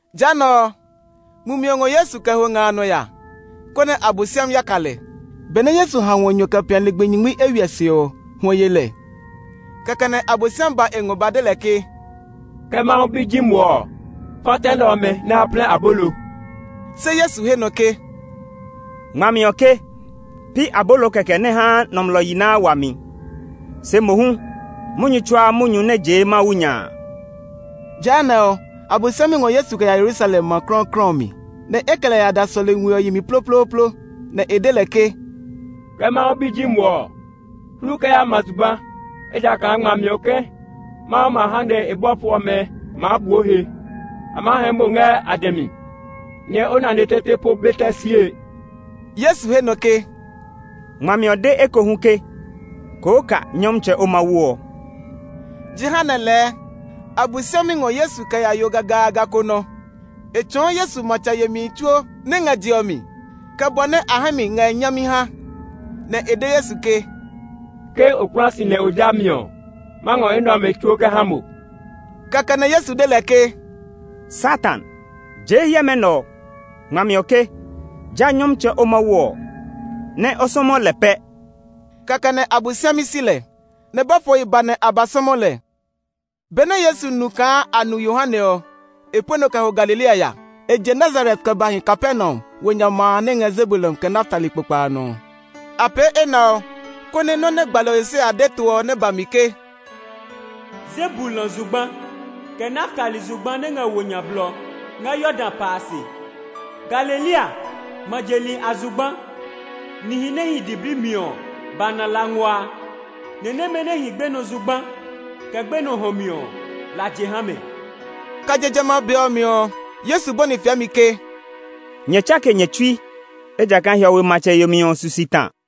Jehanɛ ɔ, Mumi ɔ ngɔ Yesu kɛ ho nga a nɔ ya, konɛ Abosiami ya ka lɛ. Benɛ Yesu ha hwɔ nyɔ kɛ pia ligbi nyingmi eywiɛ se ɔ, hwɔ ye lɛ. Kɛkɛ nɛ Abosiami ba e ngɔ ba de lɛ ke, “Ke Mawu Bi ji mo ɔ, fa tɛ nɛ ɔmɛ nɛ a plɛ abolo.” Se Yesu he nɔ ke, “Ngmami ɔ ke, ‘Pi abolo kɛkɛ nɛ haa nɔmlɔ yi naa wami, se mohu munyu tsuaa munyu nɛ jee Mawu nya a.’” Jehanɛ ɔ, Abosiami ngɔ Yesu kɛ ya Yerusalem, ma klɔuklɔu ɔ mi, nɛ e kɛ lɛ ya da sɔlemi we ɔ yi mi ploplooplo, nɛ e de lɛ ke, “Ke Mawu Bi ji mo ɔ, hlu kɛ ya ma zugba, ejakaa ngmami ɔ ke, ‘Mawu ma ha nɛ e bɔfo ɔmɛ maa bu o he. A maa hɛɛ mo ngɛ a dɛ mi, nɛ o nane tete po be tɛ sie.’” Yesu he nɔ ke, “Ngmami ɔ de ekohu ke, ‘Koo ka Nyɔmtsɛ, o Mawu ɔ.’” Jehanɛ lɛɛ Abosiami ngɔ Yesu kɛ ya yo gagaaga ko nɔ. E tsɔɔ Yesu matsɛ yemihi tsuo nɛ ngɛ je ɔ mi, kɛ bɔ nɛ a hɛ mi ngɛ nyami ha, nɛ e de Yesu ke, “Ke o kpla si nɛ o ja mi ɔ, ma ngɔ enɛ ɔmɛ tsuo kɛ ha mo.” Kɛkɛ nɛ Yesu de lɛ ke, “Satan, jee hiɛmɛ nɛ ɔ! Ngmami ɔ ke, ‘Ja Nyɔmtsɛ o Mawu ɔ, nɛ o sɔmɔ lɛ pɛ!’” Kɛkɛ nɛ Abosiami si lɛ, nɛ bɔfohi ba nɛ a ba sɔmɔ lɛ. Benɛ Yesu nu kaa a nu Yohane ɔ, e pue nɔ kɛ ho Galilea ya. E je Nazaret kɛ ba hi Kapernaum, wo nya ma a nɛ ngɛ Zebulun kɛ Naftali kpokpa a nɔ ɔ. A pee enɛ ɔ, konɛ nɔ́ nɛ gbalɔ Yesaya de to ɔ nɛ ba mi ke, “Zebulun zugba, kɛ Naftali zugba nɛ ngɛ wo nya blɔ ngɛ Yordan pa a se! Galilea, ma je li a zugba! Nihi nɛ hi diblii mi ɔ ba na la nguaa. Ni nɛmɛ nɛ hi gbenɔ zugba, kɛ gbenɔ hɔ̃ mi ɔ, la je ha mɛ.” Kɛ je jamɛ a be ɔ mi ɔ, Yesu bɔni fiɛmi ke, “Nyɛ tsake nyɛ tsui, ejakaa hiɔwe matsɛ yemi ɔ su si ta.”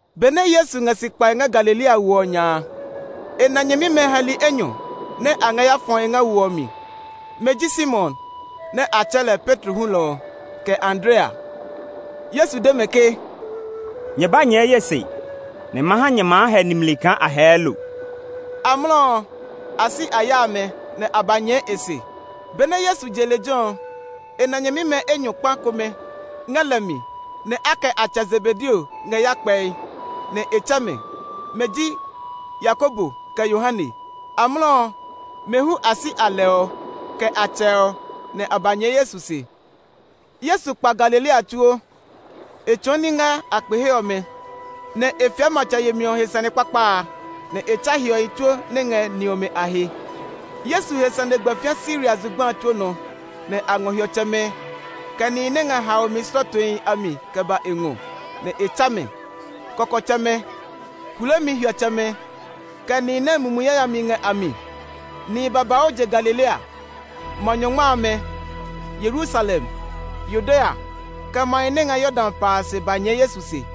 Benɛ Yesu ngɛ si kpae ngɛ Galilea wo ɔ nya a, e na nyɛmimɛ hɛli enyɔ nɛ a ngɛ ya fɔe ngɛ wo ɔ mi. Mɛ ji Simon, nɛ a tsɛɛ lɛ Petro hulɔ ɔ, kɛ Andrea. Yesu de mɛ ke, “Nyɛ ba nyɛɛ ye se, nɛ ma ha nyɛɛ maa hɛ nimli kaa a hɛɛ lo.” Amlɔ ɔ, a si a ya amɛ, nɛ a ba nyɛɛ e se. Benɛ Yesu je lejɛ ɔ, e na nyɛmimɛ enyɔ kpa komɛ ngɛ lɛ mi nɛ a kɛ a tsɛ Zebedeo ngɛ ya kpɛe, nɛ e tsɛ mɛ. Mɛ ji Yakobo kɛ Yohane. Amlɔ ɔ, mɛ hu a si a lɛ ɔ, kɛ a tsɛ ɔ, nɛ a ba nyɛɛ Yesu se. Yesu kpa Galilea tsuo; e tsɔɔ ní ngɛ a kpe he ɔmɛ, nɛ e fiɛ matsɛ yemi ɔ he sane kpakpa a, nɛ e tsa hiɔhi tsuo nɛ ngɛ ni ɔmɛ a he. Yesu he sane gbɛ fĩa Siria zugba a tsuo nɔ; nɛ a ngɔ hiɔtsɛmɛ, kɛ nihi nɛ ngɛ haomi slɔɔtohi a mi kɛ ba e ngɔ, nɛ e tsa mɛ: kɔkɔtsɛmɛ, hulemi hiɔtsɛmɛ, kɛ nihi nɛ mumi yayamihi ngɛ a mi. Nihi babauu je Galilea, Ma Nyɔngma amɛ, Yerusalem, Yudea, kɛ mahi nɛ ngɛ Yordan pa a se ba nyɛɛ Yesu se.